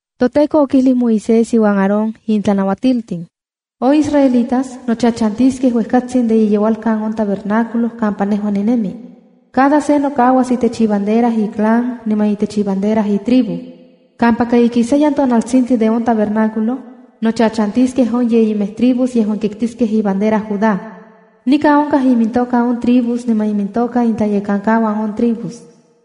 ToTEKO okijli Moisés iuan Aarón in tlanauatiltin: “On israelitas nochachantiskej uejkatsin de iyeualkan on tabernáculo kampa nejua ninemi. Cada se nokauas itech ibandera iclan niman itech ibandera itribu. ’Kampaka ikisayan tonaltsintli de on tabernáculo, nochachantiskej on yeyimej tribus yejuan kiktiskej ibandera Juda. Nikan onkaj imintoka on tribus niman imintoka intlayekankauan on tribus: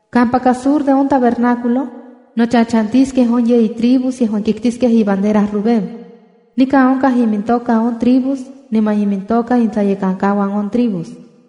Kampaka sur de on tabernáculo, nochachantiskej on yeyi tribus yejuan kiktiskej ibandera Rubén. Nikan onkaj imintoka on tribus niman imintoka intlayekankauan on tribus: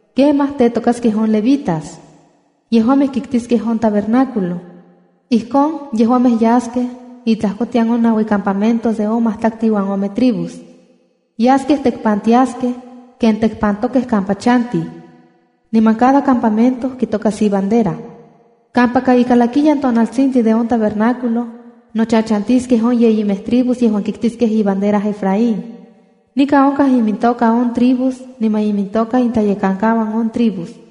’Kemaj tetokaskej on levitas. Yejuamej kiktiskej on tabernáculo. Ijkon yejuamej yaskej intlajkotian on naui campamentos de on matlaktli uan ome tribus. ’Yaskej tekpantiaskej ken tekpantokej kampa chantij, niman cada campamento kitokas ibandera. Kampaka ikalakiyan tonaltsintli de on tabernáculo, nochachantiskej on yeyimej tribus yejuan kiktiskej ibandera Efraín. Nikan onkaj imintokaj on tribus niman imintoka intlayekankauan on tribus: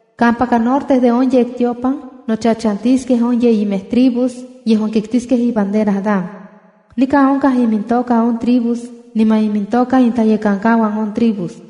Kampaka norte de on yektiopan nochachantiskej on yeyimej tribus yejuan kiktiskej ibandera Dan. Nikan onkaj imintokaj on tribus niman imintoka intlayekankauan on tribus.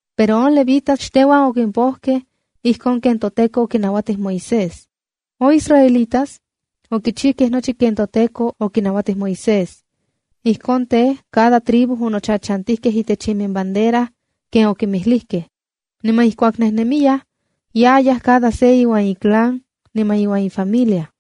Pero on levitas xteuan okimpojkej ijkon ken toTEKO okinauatij Moisés. On israelitas okichijkej nochi ken toTEKO okinauatij Moisés. Ijkon tej, cada tribu onochachantijkej itech iminbandera ken okinmijlijkej. Niman ijkuak nejnemiyaj, yayaj cada se iuan iclan niman iuan ifamilia.